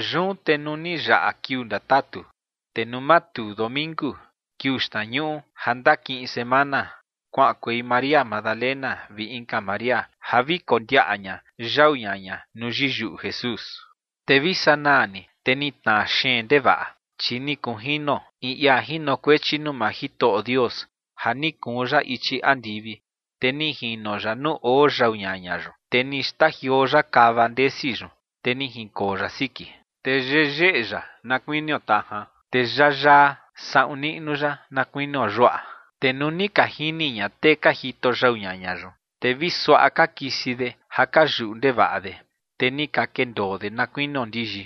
Yun te nuu ni yaꞌa kiuu ndatatu, te nuu matuu domingu, kiuu xtnañuꞌu ja ndakiꞌin semana, kuaꞌankuei María Magdalena vi inka María ja vi kondiaꞌa ña yau ñaña nuu yiyuꞌu Jesús. Te vi sanaa ni, te ni tnaa xeen ndevaꞌa, chi ni kunjino in ia jinokuechi nuu maa Jitoꞌo Dios ja ni kuun ya ichi andivi, te ni jino ya nuu oo yau ñaña yun, te ni xtajioo ya kava ndesi yun, te ni jinkoo ya siki. Te yeyeꞌe ya na kuinio tajan, te yayaa saꞌun niꞌnu ya na kuinio yuaꞌa. Te nuu ni ka jini ña tee ka jito yau ñaña yun, te vi suaꞌa ka kisi de ja ka yuꞌu ndevaꞌa de. Te ni ka kendoo de na kuinio ndiyi.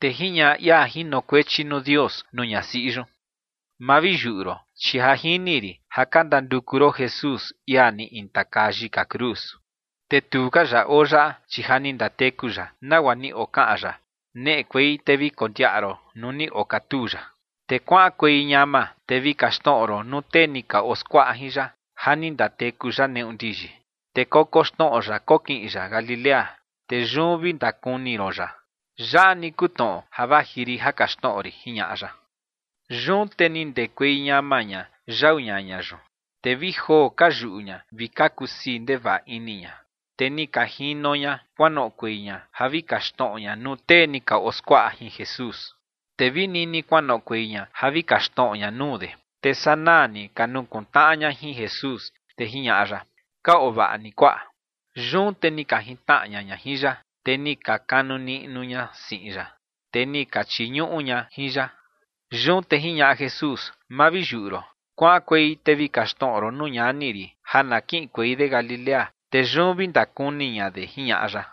Te jiñaꞌa ia jinokuechi nuu Dios nuu ñasiꞌi yun: ͏―͏Ma vi yuꞌu ron, chi ja jini rin ja ka ndanduku ron Jesús, ia ni intakaa yika cruz. Te tu ka ya oo yaꞌa, chi ja ni ndateku ya, nagua ni okaꞌan ya. Neꞌekuei te vi kondiaꞌa ron nuu ni okatuu ya. Te kuaꞌankuei ñama te vi kaxtnoꞌo ron nuu tee ni ka oo skuaꞌa jin ya ja ni ndateku ya neꞌu ndiyi. Te kokoxnoꞌo ya kokiꞌin ya Galilea, te yun vi ndakuni ron ya. Yaꞌa ni kuu tnoꞌo ja vaji rin ja kaxtnoꞌo rin ͏―͏jiñaꞌa ya. Yun te ni ndekuei ñama ña yau ñaña yun, te vi joo ka yuꞌu ña vi ka kusii ndevaꞌa ini ña. Te ni ka jino ña kuanoꞌokuei ña ja vi kaxtnoꞌo ña nuu tee ni ka oskuaꞌa jin Jesús. Te vi nini kuanoꞌokuei ña ja vi kaxtnoꞌo ña nuu de, te sanaa ni ka nukuntnaꞌa ña jin Jesús. Te jiñaꞌa ya: ͏―͏Ka oo vaꞌa ni, kuaꞌa. Yun te ni ka jintnaꞌa ña ña jin ya, te ni ka kanu niꞌnu ña siꞌin ya, te ni ka chiñuꞌu ña jin ya. Yun te jiñaꞌa Jesús: ͏―͏Ma vi yuꞌu ron. Kuaꞌankuei te vi kaxtnoꞌo ron nuu ñani rin ja na kiꞌinkuei de Galilea, te yun vi ndakuni ña de ͏―͏jiñaꞌa ya.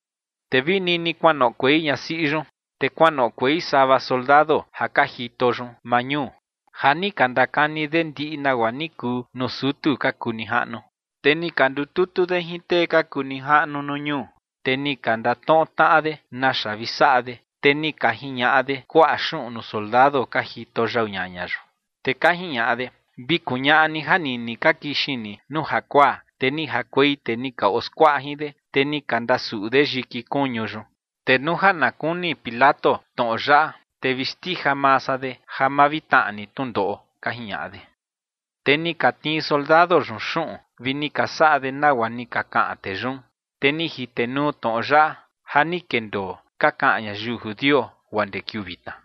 Te vi nini kuanoꞌokuei ñasiꞌi yun, te kuanoꞌokuei sava soldado ja ka jito yun maa ñuu, ja ni ka ndakani de ndiꞌi nagua ni kuu nuu sutu ka kuu nijaꞌnu. Te ni ka ndututu de jin tee ka kuu nijaꞌnu nuu ñuu, te ni ka ndatnoꞌo tnaꞌa de naxa vi saꞌa de. Te ni ka jiñaꞌa de kuaꞌa xuꞌun nuu soldado ka jito yau ñaña yun. Te ka jiñaꞌa de: ͏―͏Vi kuñaꞌa ni ja nini ka kixin ni nuu jakuaa, te ni jakuei tee ni ka oskuaꞌa jin de, te ni ka ndasuꞌu de yiki kuñu yun. Te nuu ja na kuni Pilato tnoꞌo yaꞌa, te vi xndija maa san de ja ma vi tnaꞌa ni tnundoꞌo ͏―͏ka jiñaꞌa de. Te ni ka tnii soldado yun xuꞌun vi ni ka saꞌa de nagua ni ka kaꞌan tee yun. Te ni jitenuu tnoꞌo yaꞌa ja ni kendoo ka kaꞌan ñayiu judio guaa ndee kiuu vitna.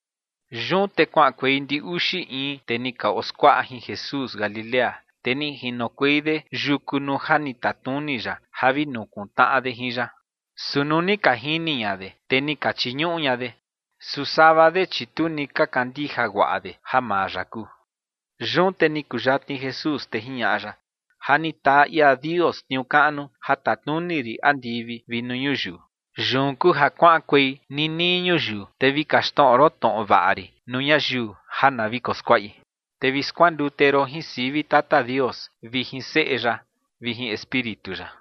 Yun te kuaꞌankuei ndi uxi in tee ni ka oskuaꞌa jin Jesús Galilea, te ni jinokuei de yuku nuu ja ni tatnuni ya ja vi nukuntnaꞌa de jin ya. Su nuu ni ka jini ña de, te ni ka chiñuꞌu ña de. Su sava de, chi tu ni ka kandija guaꞌa de ja maa ya kuu. Yun te ni kuyatni Jesús, te jiñaꞌa ya: ͏―͏Ja ni taa ia Dios tniuu kaꞌnu ja tatnuni rin andivi vi nuu ñuyiu. Yun kuu ja kuaꞌankuei ninii ñuyiu, te vi kaxtnoꞌo ron tnoꞌo vaꞌa rin nuu ñayiu ja na vi koskuaꞌi, te vi skuandute ron jin sivi Tata Dios vi jin Seꞌe ya vi jin Espíritu ya.